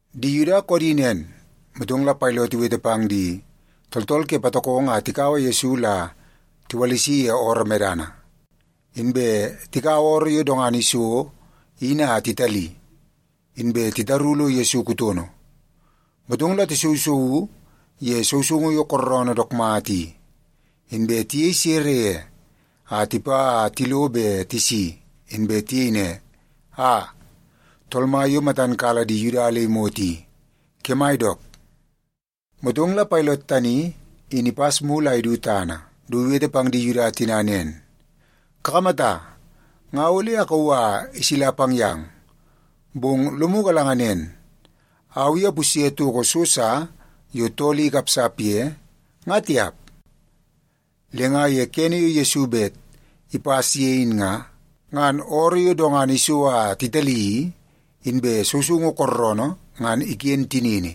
Di Yuda koodi nen, motong la Pailot iwete pang di tooltool ke patokongo a tikaua Yesu la tiwalisi ye ooroo medana. Inbe tikaua ooroo yo dongana iso in a titali, inbe titaru lo Yesu kutono. Motong la tisousouu ye sousoungu yo kooroonoo dook mata i, inbe tiyei sere ye a tipa a tilo be tisi inbe tiyei ne, “Aa, tool mai yo matam kala di Yuda le imot i, kemai dook!” Motong la Pailot tani in ipas mulu a idu tana du iwete pang di Yuda tina nen, “Kakamata, nga ole akauu a isila pang yang, bong lomu galanga nen, au i apusye toko so sa yo tool i ikapsap ye, nga tiap.” Le nga ye kene yo Yesu bet ipas ye in nga, ngan ooroo yo dongana iso a titali i, inbe sousoungu kooroonoo ngan iken tinini,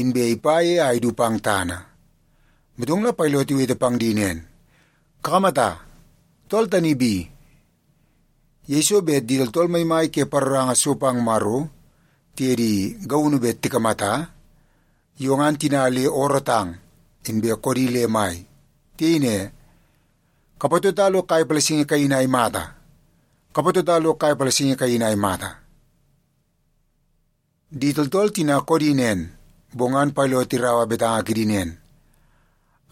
inbe ipa ye a idu pang tana. Motong la Pailot iwete pang di nen, “Kakamata, tool tani bi!” Yeiso bet di tooltool maimai ke paroranga so pang Maro tiye di gaunu bet tikamata, yo ngan tina le oorootang inbe koodi le mai. Tiyei ne, “Kapatota lo kai palasingi kaini a imata! Kapatota lo kai palasingi kaini a imata!” Di tooltool tina koodi nen, bong ngan Pailot iraua betanga kidi nen,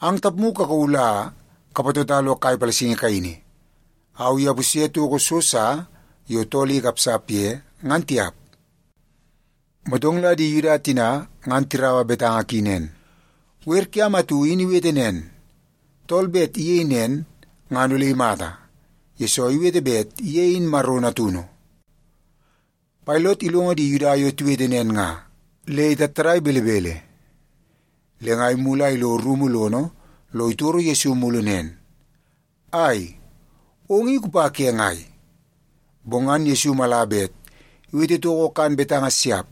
“Ang tapmu kakauu la kapatota lo kai palasingi kaini. Au i apusye toko so sa yo tool i ikapsap ye, ngan tiap.” Motong la di Yuda tina ngan tiraua betanga ki nen, “Wer kiam atu in iwete nen, tool bet iyei nen ngan ole imata, yesoo iwete bet ye in Maro Natunu.” Pailot ilongo di Yuda yo tiwete nen nga, le itattadai belebele. Le nga imulu a ilo rumu lono lo itoro Yesu mulu nen, “Ai, ong i kupa ke ngai?” Bong ngan Yesu mala bet iwete toko kan betanga siap.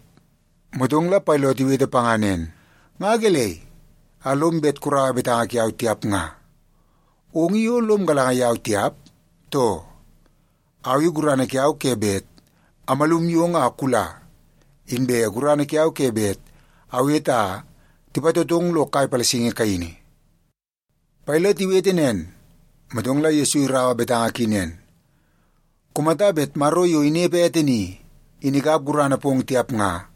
Motong la Pailot iwete panga nen, “Nga gelei a lom bet kuraua betanga kiau tiap nga? Ong i o lom galanga yau tiap, too? Au i gurana kiau ke bet amalum yong a kula, inbe gurana kiau ke bet awete a tipatotong lo kai palasingi kaini.” Pailot iwete nen, motong la Yesu iraua betanga ki nen, “Kumata bet Maro yo inepe ete ni, in ikap gurana pong tiap nga,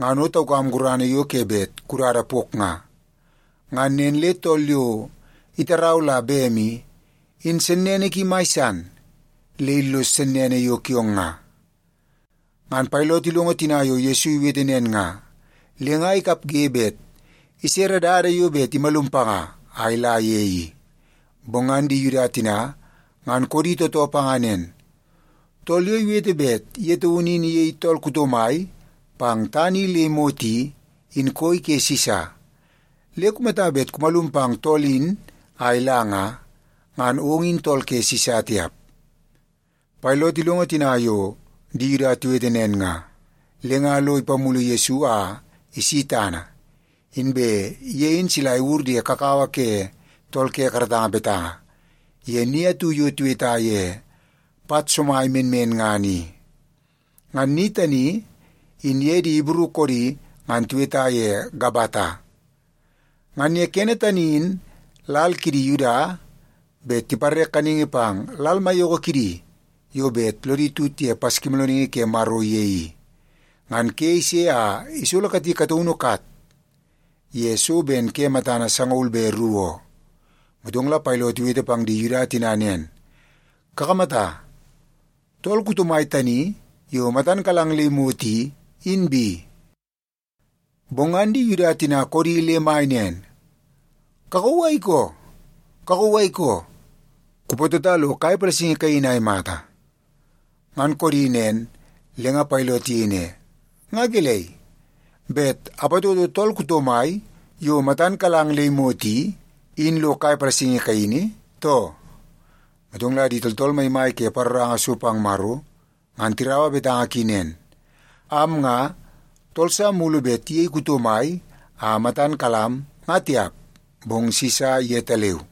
ngan o taukam gurana yo ke bet kudada pok nga. Ngan nen le tool yo itarau la bem i, in sennene ki mai san le illos sennene yo kiong nga.” Ngan Pailot ilongo tina yo Yesu iwete nen nga, le nga ikapge bet isere dada yo bet imalum panga a ila ye i. Bong ngan di Yuda tina ngan koodi tootoo panga nen, “Tool yo iwete bet ye taunu in iyei tool kuto mai pang tana i le imot i, in koi ke Sisa. Le kumata bet kumalum pang tool in a ila nga, ngan ong in tool ke Sisa tiap.” Pailot ilongo tina yo di Yuda tiwete nen nga, le nga lo ipamulu Yesu a isi tana, inbe ye in sila iwur ye kakawa ke tool ke karatanga betanga, ye ni atu yo tiweta ye Pat Somai Menmenngana i. (Ngan ni tani in ye di Ibru koodi ngan tiweta ye Gabata.) Ngan ye kene tani in lal kidi Yuda bet tipare kaningi pang lal maiyoko kidi yo bet lodi tut ye Paskimoolooningi Ke Maro ye i. Ngan ke ise a isolo kati kataunu kat ye so ben ke matana sangaul be ru oo. Motong la Pailot iwete pang di Yuda tina nen, “Kakamata, tool kuto mai tani yo matan kalang le imot i, in bi.” Bong ngan di Yuda tina koodi le mai nen, “Kakauu a ikoo! Kakauu a ikoo! Kupatota lo kai palasingi kaini a imata!” Ngan koodi nen, le nga Pailot iyei ne, “Nga gelei, bet apatoto tool kuto mai yo matan kalang le imot i, in ilo kai palasingi kaini, too?” Motong la di tooltool maimai ke paroranga so pang Maro ngan tiraua betanga ki nen, “Am nga, tool sa mulu bet iyei kuto mai a matan kalam, nga tiap, bong Sisa yetaleu.”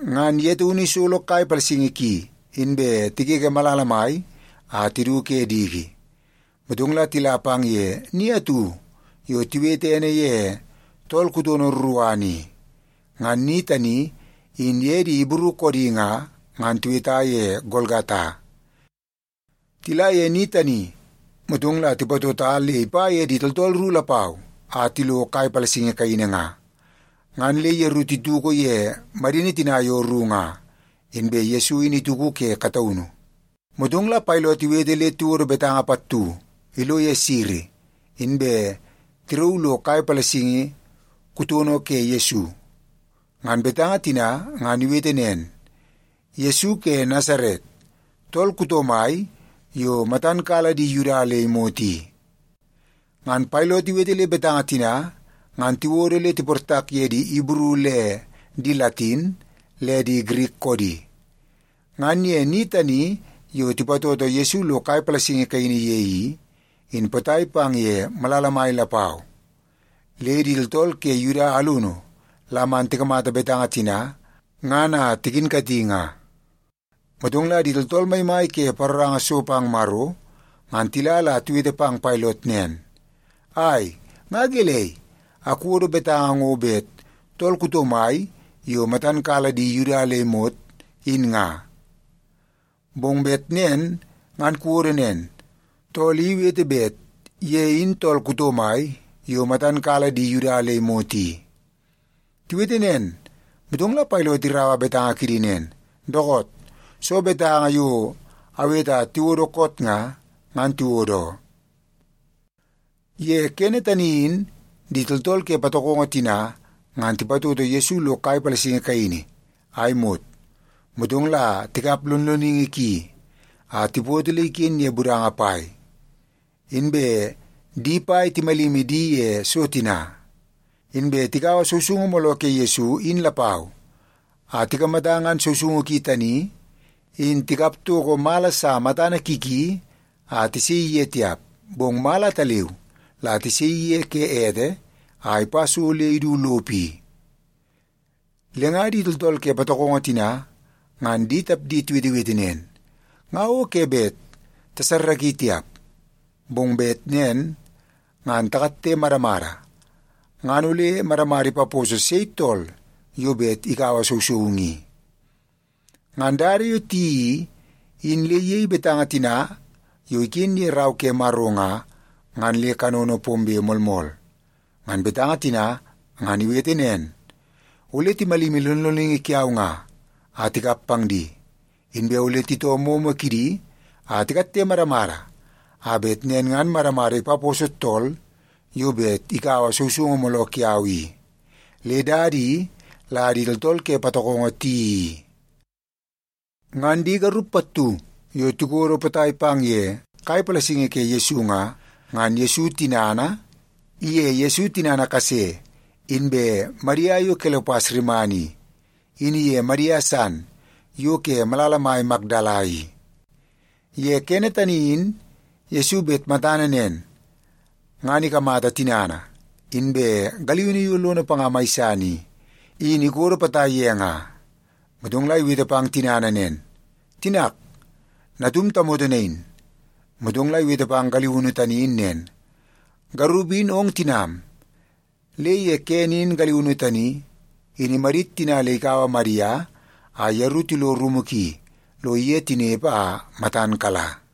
Ngan ye taunu isolo kai palasingi ki, inbe tigege malala mai a tidu ke diki, motong la tila pang ye ni atu yo tiwete ene ye Tool Kutono Ruruana i. (Ngan ni tani in ye di Ibru koodi nga, ngan tiweta ye Golgata). Tila ye ni tani, motong la tipatota le ipa ye di tooltool ru lapau a tilo kai palasingi kaini nga. Ngan le yeru tituku ye madini tina yo ru nga, inbe Yesu in ituku ke kataunu. Motong la Pailot iwete le tiwodo betanga pattu ilo ye siri, inbe tirauu lo kai palasingi kutono ke Yesu. Ngan betanga tina ngan iwete nen: Yesu Ke Nasaret, Tool Kuto Mai Yo Matan Kala Di Yuda Le Imot I. Ngan Pailot iwete le betanga tina ngan tiwodo le tiportak ye di Ibru le di Latin le di Girik koodi. Ngan ye ni tani yo tipatoto Yesu lo kai palasingi kaini ye i, in potai pang ye malala mai lapau. Le di tooltool ke Yuda alunu la man tikamata betanga tina ngan a tikinkati nga. Motong la di tooltool maimai ke paroranga so pang Maro ngan tila la tiwete pang Pailot nen, “Ai, nga gelei a kuwodo betanga ngo bet ‘Tool Kuto Mai Yo Matan Kala Di Yuda Le Imot,’ in nga? Bong bet nen ngan kuwodo nen, ‘Tool I Iwete Bet Ye In Tool Kuto Mai Yo Matan Kala Di Yuda Le Imot I.’” Tiwete nen, motong la Pailot iraua betanga kidi nen, “Dookoot, soo betanga yo awete a tiwodo koot nga, ngan tiwodo oo.” Ye kene tani in di tooltool ke patokongo tina ngan tipatoto Yesu lo kai palasingi kaini a imot, motong la tikap lonloningi ki a tipoto le iken ye budanga pai. Inbe di pai timalimi di ye so tina. Inbe tikaua sousoungu mooloo ke Yesu in lapau a tikamata ngan sousoungu ki tani in tikap toko mala sa matana ki ki a tisaii ye tiap, bong mala ataleu la tisaii ye ke ete a ipa so le idu lopo i. Le nga di tooltool ke patokongo tina ngan di tapdi tiwetewete nen, “Nga o ke bet tasarraki tiap. Bong bet nen ngan takatte madamada ngan ole madamada ipaposo sei tool yo bet ikaua sousoungu i.” Ngan dada yo tiyeii i, in le iyei betanga tina yo iken ye Rau ke Maro nga, ngan le kanono pombe moolmool. Ngan betanga tina ngan iwete nen, “Ole timalimi lonloningi kiau nga, a tikap pang di. Inbe ole titoo moomoo kidi a tikatte madamada a bet nen ngan madamada ipaposo tool yo bet ikaua sousoungu mooloo kiau i.” Le dada i la di tooltool ke patokongo tiyeii i. Ngan di garup pattu yo tikodo potai pang ye kai palasingi ke Yesu nga, ngan Yesu tinana, iye Yesu tinana kase, inbe Madia yo Kelopas rimana i, in iye Madia san yo ke malala mai Makdala i. Ye kene tani in Yesu bet matana nen, ngan ikamata tinana, inbe galiunu yo lono panga mai san i, in ikodo potai ye nga. Motong la iwete pang tinana nen, “Tinak, natum tamoto nain.” Motong la iwete pang galiunu tani in nen, “Garup in ong tinam.” Le ye kene in galiunu tani, in imadit tina le ikaua Madia a yeru tilo rumu ki lo iye tinepe a matan kala.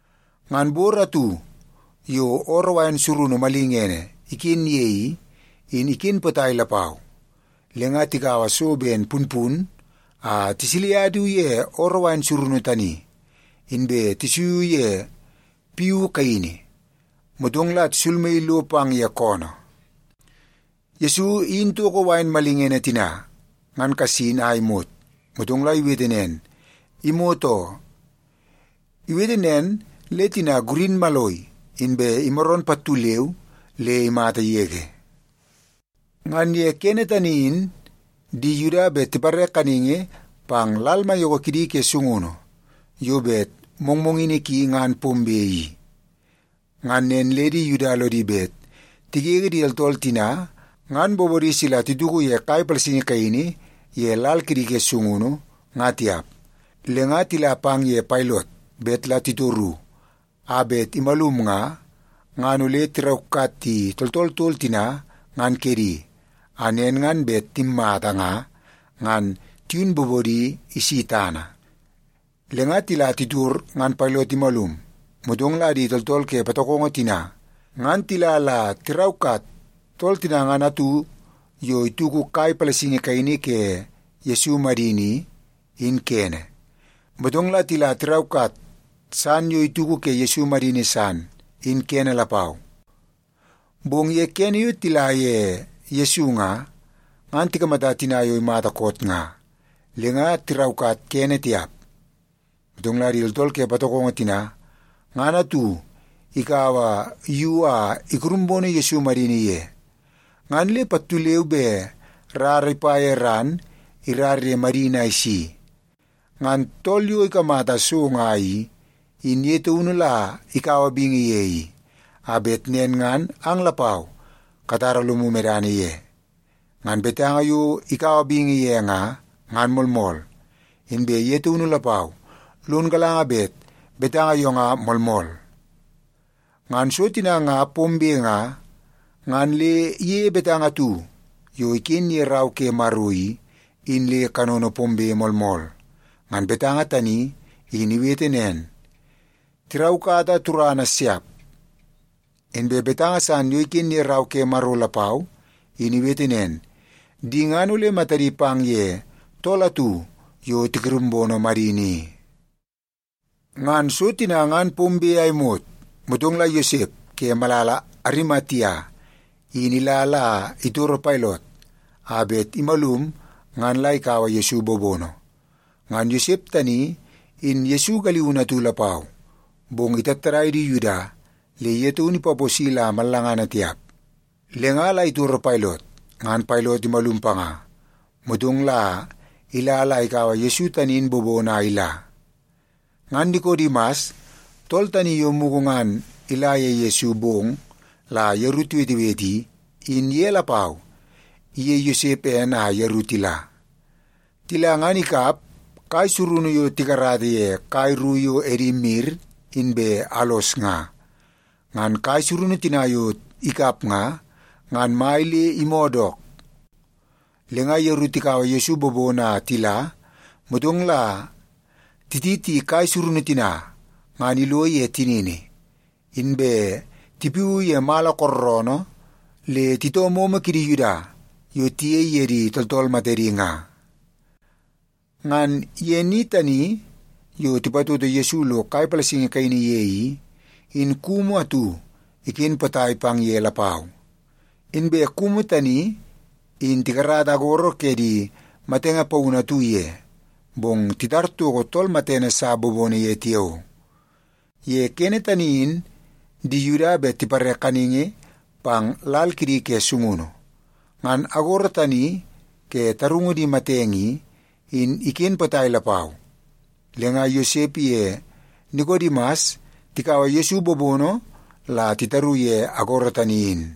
Ngan bor atu yo ooroo wain surunu malingene iken ye i, in iken potai lapau. Le nga tikaua so ben punpun a tisilia du ye ooroo wain surunu tani, inbe tisuiu ye piu kaini, motong la tisulmaii lo pang ye koonoo. Yesu iyini toko wain malingene tina ngan kasin a imot, motong la iwete nen, “Imot oo.” Iwete nen le tina gurin maloi, inbe imaroon pattu leu le imata yege. Ngan ye ke tani in di Yuda bet tipare kaningi pang lal maiyoko kidi ke sungunu yo bet mongmongini ki ngan pombe i. Ngan nen le di Yuda lodi bet tigege di tooltool tina ngan bobodi sila tituku kai palasingi kaini ye lal kidi ke sungunu, nga tiap. Le nga tila pang ye Pailot bet la titoru a bet imalum nga, ngan la tiraukat di tooltool tol tina ngan kedi, a nen ngan bet timmata nga, ngan tiyun bobodi isi tana. Le nga tila titor ngan Pailot imalum, motong la di tooltool ke patokongo tina ngan tila la tiraukat tool tina ngan atu yo ituku kai palasingi kaini ke Yesu madini i, in kene. Motong la tila tiraukat san yo ituku ke Yesu madini san, in kene lapau. Bong ye kene yo tila ye Yesu nga, ngan tikamata tina yo imata koot nga, le nga tiraukat kene tiap. Motong la di tooltool ke patokongo tina, ngan atu ikaua yu a ikurumbono Yesu madini ye. Ngan le pattu leu be rara ipa ye ran irara ye madini a isi. (Ngan tool yo ikamata so nga i, in ye taunu la ikaua bingi ye i, a bet nen ngan ang lapau katara lomu medana ye. Ngan betanga yo ikaua bingi ye nga, ngan moolmool. Inbe ye taunu lapau, lon galanga bet betanga yo nga moolmool.) Ngan so tina nga pombe nga, ngan le iyeie betanga atu yo iken ye Rau ke Maro i, in le kanono pombe moolmool. Ngan betanga tani in iwete nen, “Tiraukata turana siap.” Inbe betanga san yo iken ye Rau ke Maro lapau, in iwete nen, “Di ngan ole matadi pang ye tool atu yo tikurumbono madini i.” Ngan so tina ngan pombe a imot, motong la Yosep ke malala Arimatia in ila la itoro Pailot a bet imalum ngan la ikaua Yesu bobono. Ngan Yosep tani in Yesu galiunu atu lapau, bong itattadai di Yuda le ye taun ipaposi la mallangana tiap. Le nga la itoro Pailot, ngan Pailot imalum panga, motong la ila la ikaua Yesu tani in bobono a ila. Ngan Nikodimas, tool tani yo mugu ngan ila ye Yesu bong la yeru tiwetewete i, in ye lapau iyei Yosep ene a yeru tila. Tila ngan ikap kai surunu yo tikarata ye kai ru yo edi mir inbe alos nga. Ngan kai surunu tina yo ikap nga, ngan mai le imoo dook. Le nga yeru tikaua Yesu bobono a tila, motong la titi kai surunu tina ngan ilo ye tinini, inbe tipiuu ye mala kookoonoo le titoo momo kidi Yuda yo tiyei ye di tooltool matedi nga. Ngan ye ni tani yo tipatoto Yesu lo kai palasingi kaini ye i, in kumu atu iken potai pang ye lapau. Inbe kumu tani in tikarata agoro ke di matenge paunu atu ye, bong titar toko tool matene sa bobono ye tiao. Ye kene tani in di Yuda bet tipare kaningi pang lal kidi ke sungunu. Ngan agoro tani ke tarungu di matenge i, in iken potai lapau. Le nga Yosep iye Nikodimas tikaua Yesu bobono la titaru ye agoro tani in.